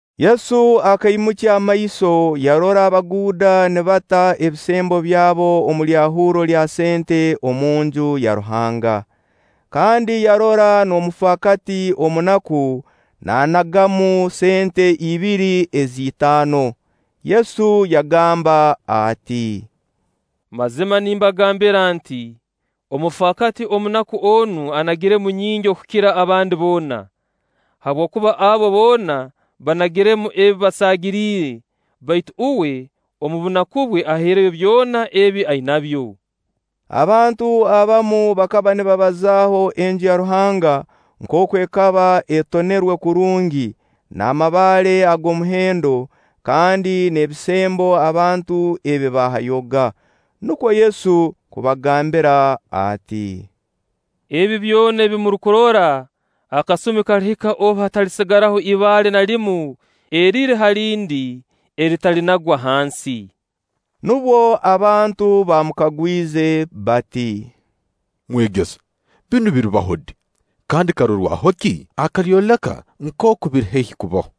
Yesu akaimukya amaiso yarora abaguuda nibata ebisembo byabo omu lyahurro lya sente omunju ya Ruhanga; kandi yarora n'omufaakati omunaku naanagamu sente ibiri ez'itaano. Yesu yagamba ati: “Mazima nimbagambira nti: Omufaakati omunaku onu anagiremu nyingi okukira abandi boona. Habwokuba abo boona banagiremu ebi basaagiriire; baitu uwe omu bunaku bwe ahaireyo byona ebi ainabyo.” Abantu abamu bakaba nibabazaaho Enju ya Ruhanga nkooku ekaba etonerwe kurungi n'amabaale ag'omuhendo kandi n'ebisembo abantu ebi baahayoga. Nukwo Yesu kubagambira ati: “Ebi byona ebi murukurora, akasumi kalihika obu hatalisigara ibaale na limu eriri ha lindi, eritalinagwa hansi.” Nubwo abantu baamukagwize bati: “Mwegesa, binu biribaho di? Kandi karorwaho ki akalyoleka nkooku biri haihi kubaho?”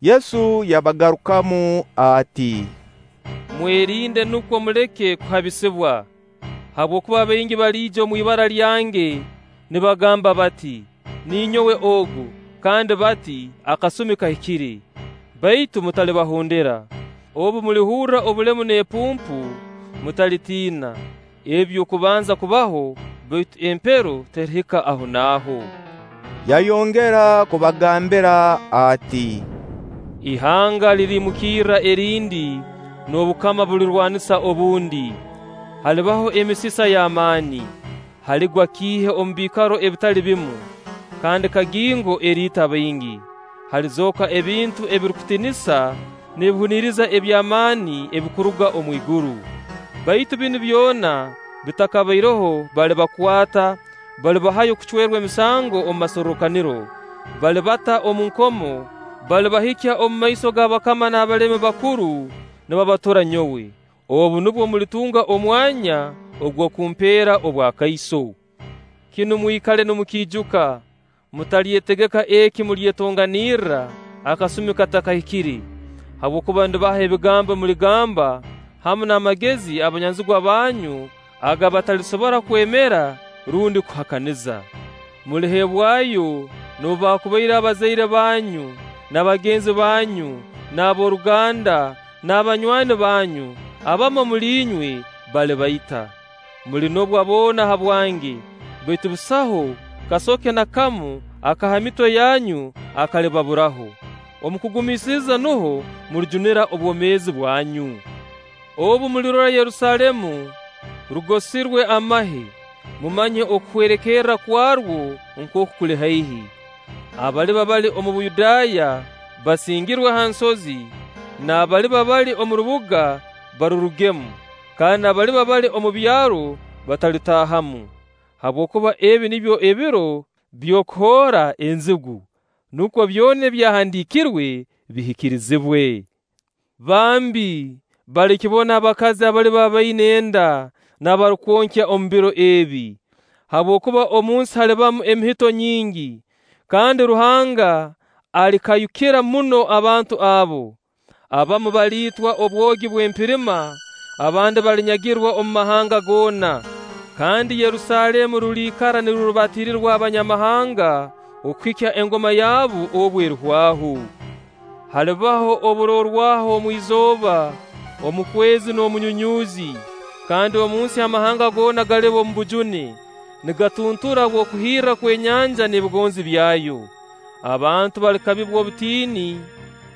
Yesu yabagarukamu ati: “Mwerinde nukwo muleke kuhabisibwa; habwokuba baingi baliija omu ibara lyange nibagamba bati: ‘Ninyowe ogu!’ Kandi bati: ‘Akasumi kahikire!’ Baitu mutalibahondera. Obu mulihurra obulemu n'epumpu, mutalitiina; ebi by'okubanza kubaho, baitu empero terihika ahonaaho.” Yayongera kubagambira ati: “Ihanga liriimukirra erindi, n'obukama bulirwanisa obundi. Halibaho emisisa y'amaani, haligwa kiihe omu biikaro ebitali bimu, kandi kagingo eriita baingi; halizooka ebintu ebirukutiinisa n'ebihuniriza eby'amaani ebirukuruga omu iguru. “Baitu binu byona bitakabaireho balibakwata, balibahayo kucwerwa emisango omu masorrokaniro, balibata omu nkomo, balibahikya omu maiso g'abakama n'abalemi bakuru nibabatura nyowe. Obu nubwo mulitunga omwanya ogw'okumpeera obwakaiso. Kinu mwikale nimukiijuka: mutalyetegeka eki mulyetonganirra akasumi katakahikire; habwokuba ndibaha ebi muligamba hamu n'amagezi abanyanzigwa banyu aga batalisobora kwemera rundi kuhakaniza. Muliheebwayo noobu baakubaire abazaire banyu, n'abagenzi banyu, n'ab'oruganda, n'abanywani banyu; abamu omuli inywe balibaita. Mulinobwa boona habwange. Baitu busaho kasoke na kamu aka ha mitwe yanyu akalibaburaho. Omu kugumiisiriza nuho mulijunira obwomeezi bwanyu.” “Obu mulirora Yerusaalemu rugosirwe amahe, mumanye okuhwerekerra kwarwo nkooku kuli haihi. Abaliba bali omu Buyudaaya basingirwe ha nsozi, n'abaliba bali omu rubuga barurugemu, kandi n'abaliba bali omu byaro batalirutaahamu. Habwokuba ebi nibyo ebiro by'okuhoora enzigu, nukwo byona Ebyahandiikirwe bihikirizebwe. Bambi! Balikibona abakazi abaliba baina enda n'abarukwonkya omu biro ebi! Habwokuba omunsi halibamu emihito nyingi, kandi Ruhanga alikayukira muno abantu abo. Abamu baliitwa obwogi bw'empirima, abandi balinyagirwa omu mahanga goona, kandi Yerusaalemu ruliikara nirurubatirirwa Abanyamahanga okuhikya engoma yabo obu erihwaho.” “Halibaho oburorwaho omu izooba, omu kwezi, n'omu nyunyuuzi; kandi omu nsi amahanga goona galiba omu bujune, nigatuntura habw'okuhirra kw'enyanja n'ebigonzi byayo. Abantu balikabibwa obutiini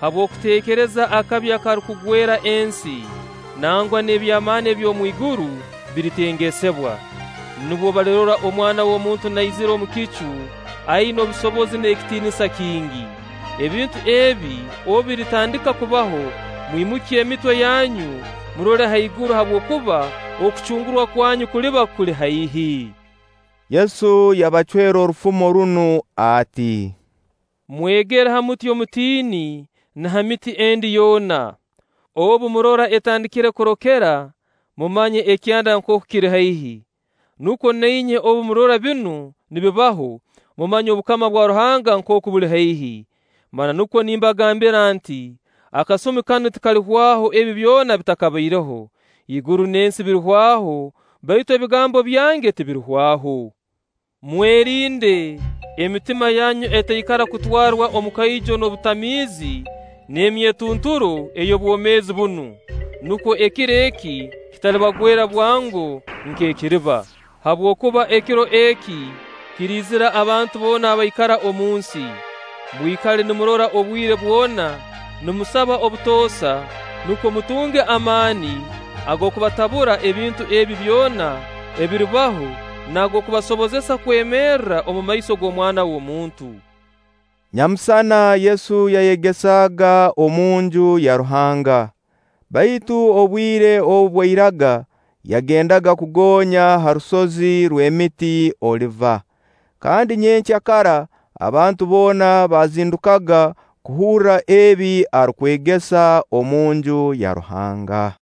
habw'okuteekereza akabi akarukugwera ensi; nangwa n'eby'amaani eby'omwiguru biritengesebwa. Nubwo balirora Omwana w'omuntu naizira omu kicu aina obusobozi n'ekitiinisa kingi. Ebintu ebi obu biritandika kubaho, mwimukye emitwe yanyu, murole haiguru habwokuba okucungurwa kwanyu kuliba kuli haihi.” Yesu yabacwera orufumo runu ati: “Mwegere ha muti omutini na ha miti endi yoona. Obu murora etandikire kurokera, mumanya ekyanda nkooku kiri haihi. Nukwo na inywe obu mulirora binu nibibaho, mumanye obukama bwa Ruhanga nkooku buli haihi. Mananukwo nimbagambira nti: Akasumi kanu tikalihwaho ebi byona bitakabaireho. Iguru n'ensi birihwaho, baitu ebigambo byange tibirihwaho.” “Mwerinde! Emitima yanyu etaikara kutwarwa omukoijo n'obutamiizi n'emyetunturo ey'obwomeezi bunu, nukwo ekiro eki kitalibagwera bwango nk'ekiriba. Habwokuba ekiro eki kiriizira abantu boona abaikara omunsi. Mwikale nimurora obwire bwona, nimusaba obutoosa nukwo mutunge amaani ag'okubatabura ebintu ebi byona ebiribaho n'ag'okubasoboza kwemerra omu maiso g'Omwana w'omuntu.” Nyamusana Yesu yayegesaaga omunju ya Ruhanga, baitu obwire obu bwairaga yagendaga kugonya ha rusozi rw'emiti Oliva. Kandi nyenkya kara abantu boona baazindukaga kuhurra ebi arukwegesa omu Nju ya Ruhanga.